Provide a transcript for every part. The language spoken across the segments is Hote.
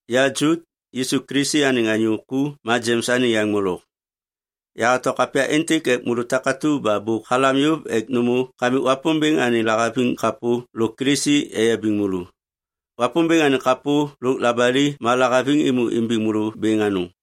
Ya Jut, Yisu Kilisi anêŋ anyô ku ma Jems anêŋ yaŋ molok. Yahato kapya êntêk ek môlô takatu ba bôk halam yôv ek nômô Kamik Wapômbêŋ anêŋ lahaviŋ kapô lôk Kilisi eyabiŋ môlô. Wapômbêŋ anêŋ kapô lôk labali ma lahaviŋ êmô imbiŋ môlô bêŋ anôŋ.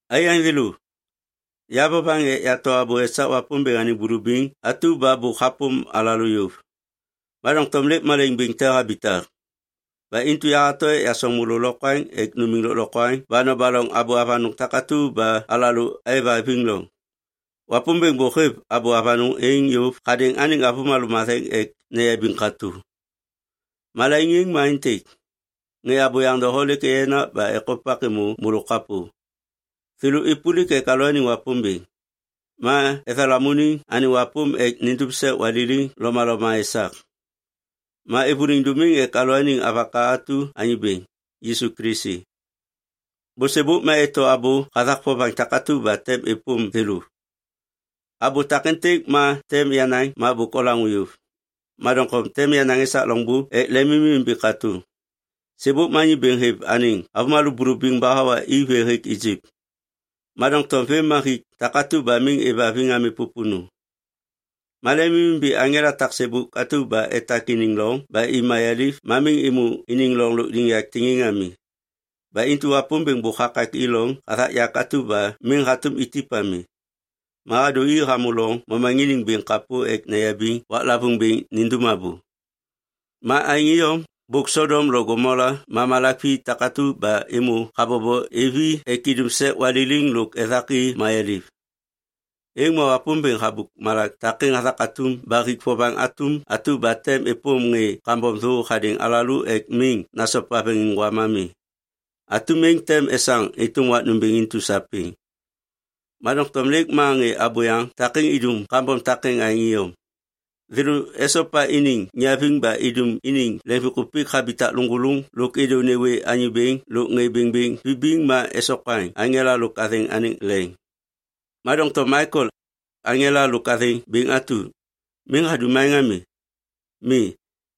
Aiyaŋ thêlô, ya vovaŋ ek yato abô esak Wapômbêŋ anêŋ bulubiŋ atu ba bôk hapôm alalô yôv. Ma doŋtom lêk malaiŋ bêŋ te habitak. Ba intu yahato ek yasoŋ môlô lokwaŋ ek numiŋ lôklokwaŋ ba nobaloŋ abô avanôŋ takatu ba alalô aêvhaviŋ loŋ. Wapômbêŋ bôk hêv abô avanôŋ êŋ yôv hadêŋ anêŋ avômalô matheŋ ek neyabiŋ katô. Malaiŋ êŋ ma aêntêk. Ŋê abôyaŋ doho lêk eyenak ba ekopak êmô môlô kapô. Thêlô êpôlik ek alalôaniŋ Wapômbêŋ. Ma ethalamuniŋ anêŋ wapôm ek nindum sek waliliŋ lomaloma esak. Ma êvôliŋ dômiŋ ek alalôaniŋ Avaka atu Anyô Bêŋ, Yisu Kilisi. Bôsêbôk ma eto abô hathak vovaŋ takatu ba tem êpôm thêlô. Abô takêntêk ba tem yanaŋ ma bôk olaŋô yôv. Ma doŋtom tem yanaŋ esak loŋbô ek lemimimbi katô. Sêbôk ma Anyô Bêŋ hêv anêŋ avômalô bulubiŋ ba hawa i vê hêk Ijip. Ma doŋtom vêm ma hik takatu ba miŋ êvhaviŋ ami pôpônô. Ma lemimimbi aŋela taksêbôk atu ba etak iniŋ loŋ ba i mayaliv ma miŋ êmô iniŋ loŋ lôkliŋyak tiŋiŋ ami. Ba intu Wapômbêŋ bôk hakak i loŋ hathak yak atu ba miŋ hatôm itip ami. Ma hadô i hamô loŋ momaŋiniŋ bêŋ kapô ek neyabiŋ waklavôŋ bêŋ nindum abô. Ma aêŋ iyom, bôk Sodom lo Gomola ma malak vi takatu ba êmô habobo êv i ek idum sek waliliŋ lôk ethak i mayaliv. Êŋ ma Wapômbêŋ habôk malak takêŋ hathak atum ba hik vovaŋ atum atu ba tem êpôm ŋê kambom thô hadêŋ alalô ek miŋ nasopa veŋiŋgwam ami. Atum êŋ tem esaŋ êtôm wak nômbêŋ intu sapêŋ. Ma doŋtom lêk ma ŋê abôyaŋ takêŋ idum kambom takêŋ aêŋ iyom. Thêlô esopa iniŋ niaviŋ ba idum iniŋ leŋviŋkupik habitak lôŋgôlôŋ lôk êdô nêwê Anyô Bêŋ lôk ŋê bêŋbêŋ vibiŋ ma esokwaŋ aŋela lôk athêŋ anêŋ leŋ. Ma doŋtom Maikel, aŋela lôk athêŋ bêŋ atu, miŋ hadum aêŋ ami. Mi,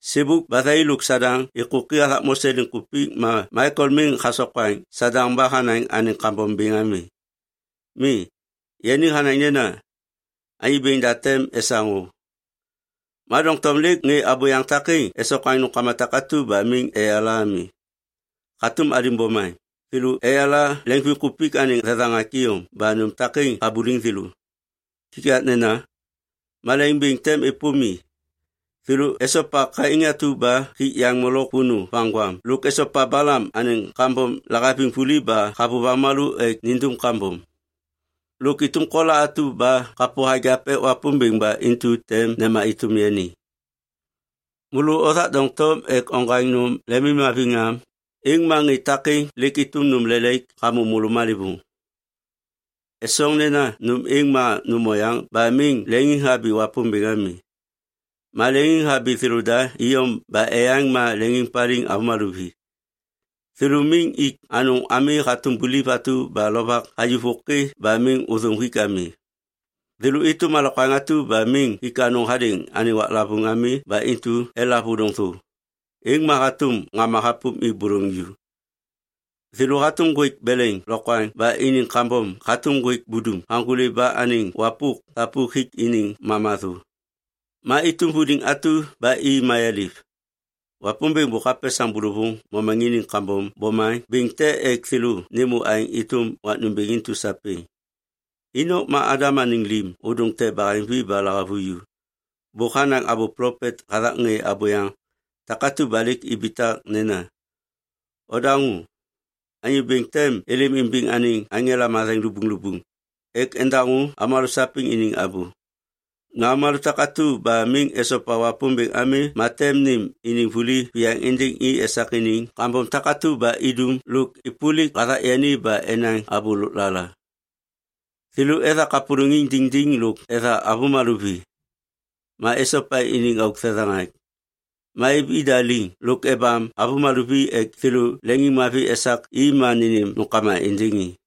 sêbôk ba thai lôk Sadaŋ êkôki hathak Mose liŋkupik ma Maikel miŋ hasokwaŋ Sadaŋ ba hanaŋ anêŋ kambom bêŋ ami. Mi. Yani hanaŋ nena, “Anyô Bêŋ da tem esaŋ o.” Ma doŋtom lêk ŋê abôyaŋ takêŋ esokwaŋ nômkama takatu ba miŋ eyala ami. Hatôm alim bomaŋ, thêlô eyala leŋviŋkupik anêŋ thethaŋak iyom ba nôm takêŋ habuliŋ thêlô. Kikaknena, malaiŋ bêŋ tem êpôm i! Thêlô esopa Kain atu ba hik yaŋ molok vônô vaŋgwam lôk esopa Balam anêŋ kambom lahaviŋ vuli ba havôv avômalô ek nindum kambom. Lôk êtôm Kola atu ba kapô hagiap ek Wapômbêŋ ba intu tem nema êtôm yani. Môlô othak doŋtom ek oŋgwaŋ nôm lemimhaviŋ am, êŋ ma ŋê takêŋ lêk êtôm nôm lelaik hamô môlô malêvôŋ. Esoŋ nena nôm êŋ ma nôm oyaŋ ba miŋ leŋiŋhabi Wapômbêŋ ami. Ma leŋiŋhabi thêlôda iyom ba eyaŋ ma leŋiŋpaliŋ avômalô vi. Thêlô miŋ ik anôŋ ami hatôm buliv atu ba lovak hayuv vôkê ba miŋ ôthôm hik ami. Thêlô êtôm alokwaŋ takatu ba miŋ hik anôŋ hadêŋ anêŋ waklavôŋ ami ba intu elav ôdôŋ thô, êŋ ma hatôm ŋama hapôm i bôlôŋ ju. Thêlô hatôm ŋgwêk beleŋ lokwaŋ ba iniŋ kambom hatôm ŋgwêk budum haŋgôli ba anêŋ wapôk thapuk hik iniŋ mama thô. Ma êtôm vuliŋ atu ba i mayaliv. Wapômbêŋ bôk hapesaŋ bôlôvôŋ momaŋiniŋ kambom bomaŋ bêŋ te ek thêlô nêmô aêŋ êtôm wak nômbêŋ intu sapêŋ. Inok ma Adam anêŋ lim ôdôŋ te baheŋvi ba lahavuju. Bôk hanaŋ abô plopet hathak ŋê abôyaŋ takatu ba lêk ibitak nena, “Odaŋô! Anyô Bêŋ tem êlêm imbiŋ anêŋ aŋela matheŋ lubuŋlubuŋ ek endaŋô avômalô sapêŋ iniŋ abô. Ma avômalô takatu ba miŋ esopa Wapômbêŋ ami ma tem nêm iniŋ vuli viyaŋ êndêŋ i esak iniŋ kambom takatu ba idum lôk êpôlik hathak yani ba enaŋ abô lôklala.” Thêlô ethak kapôlôŋiŋ diŋdiŋ lôk etha avômalô vi. Ma esopa iniŋ auk thethaŋak. Ma êv ida liŋ lôk ebam avômalô vi ek thêlô leŋiŋmavi esak i ma nênêm nômkama êndêŋ i.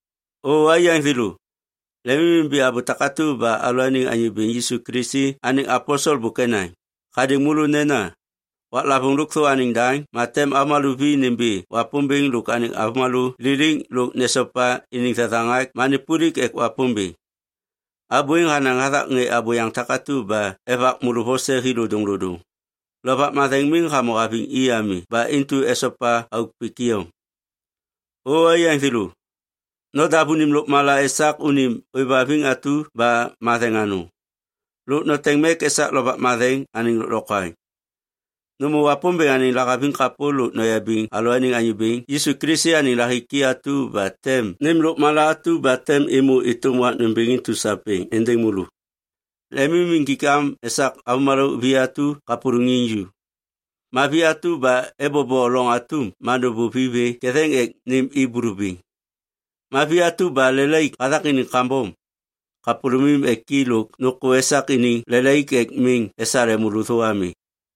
O aiyaŋ thêlô, lemimimbi abô takatu ba alalôaniŋ Anyô Bêŋ Yisu Kilisi anêŋ aposel bôk enaŋ hadêŋ môlô nena, “Waklavôŋ lôkthô anêŋ daŋ ma tem avômalô vi nimbi Wapômbêŋ lôk anêŋ avômalô liliŋ lôk nesopa iniŋ thethaŋak ma nêpôlik ek Wapômbêŋ.” Abô êŋ hanaŋ hathak ŋê abôyaŋ takatu ba evak môlô vose hi lodôŋlodôŋ. Lovak Matheŋ miŋ hamô haviŋ i ami ba intu esopa auk pik iyom. O aiyaŋ thêlô, nodav unim lôkmala esak unim ôêvhaviŋ atu ba matheŋ anôŋ. Lôk noteŋ mek esak Lovak Matheŋ anêŋ lôklokwaŋ. Nômô Wapômbêŋ anêŋ lahaviŋ kapô lôk noyabiŋ alalôaniŋ Anyô Bêŋ Yisu Kilisi anêŋ lahiki atu ba tem nêm lôkmala atu ba tem êmô êtôm wak nômbêŋ intu sapêŋ êndêŋ môlô. Lemim injik am esak avômalô vi atu kapôlôŋiŋ ju. Ma vi atu ba ebobo loŋ atum ma nôbôv i vê ketheŋ ek nêm i bulubiŋ. Ma vi atu ba lelaik hathak iniŋ kambom, kapôlômim ek i lôk nôkô esak iniŋ lelaik ek miŋ esale môlô thô ami.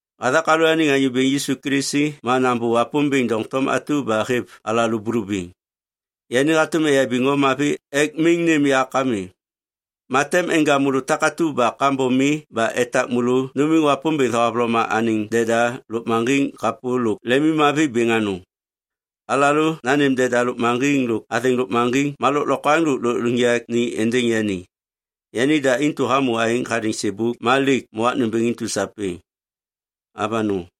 Hathak alalôaniŋ Anyô Bêŋ Yisu Kilisi ma nambô Wapômbêŋ doŋtom atu ba hêv alalô bulubiŋ. Yani hatôm eyabiŋ o mavi ek miŋ nêm yak ami. Ma tem enja môlô takatu ba kambom mi ba etak môlô numiŋ Wapômbêŋ thohavloma anêŋ deda lôkmaŋgiŋ kapô lôk lemimmavi bêŋ anôŋ. Alalô nanêm deda lôkmaŋgiŋ lôk athêŋ lôkmaŋgiŋ ma lôklokwaŋ lôk lôkliŋyak ni êndêŋ yani. Yanida intu hamô aêŋ hadêŋ sêbôk ma lêk ma wak nômbêŋ intu sapêŋ! Avanôŋ.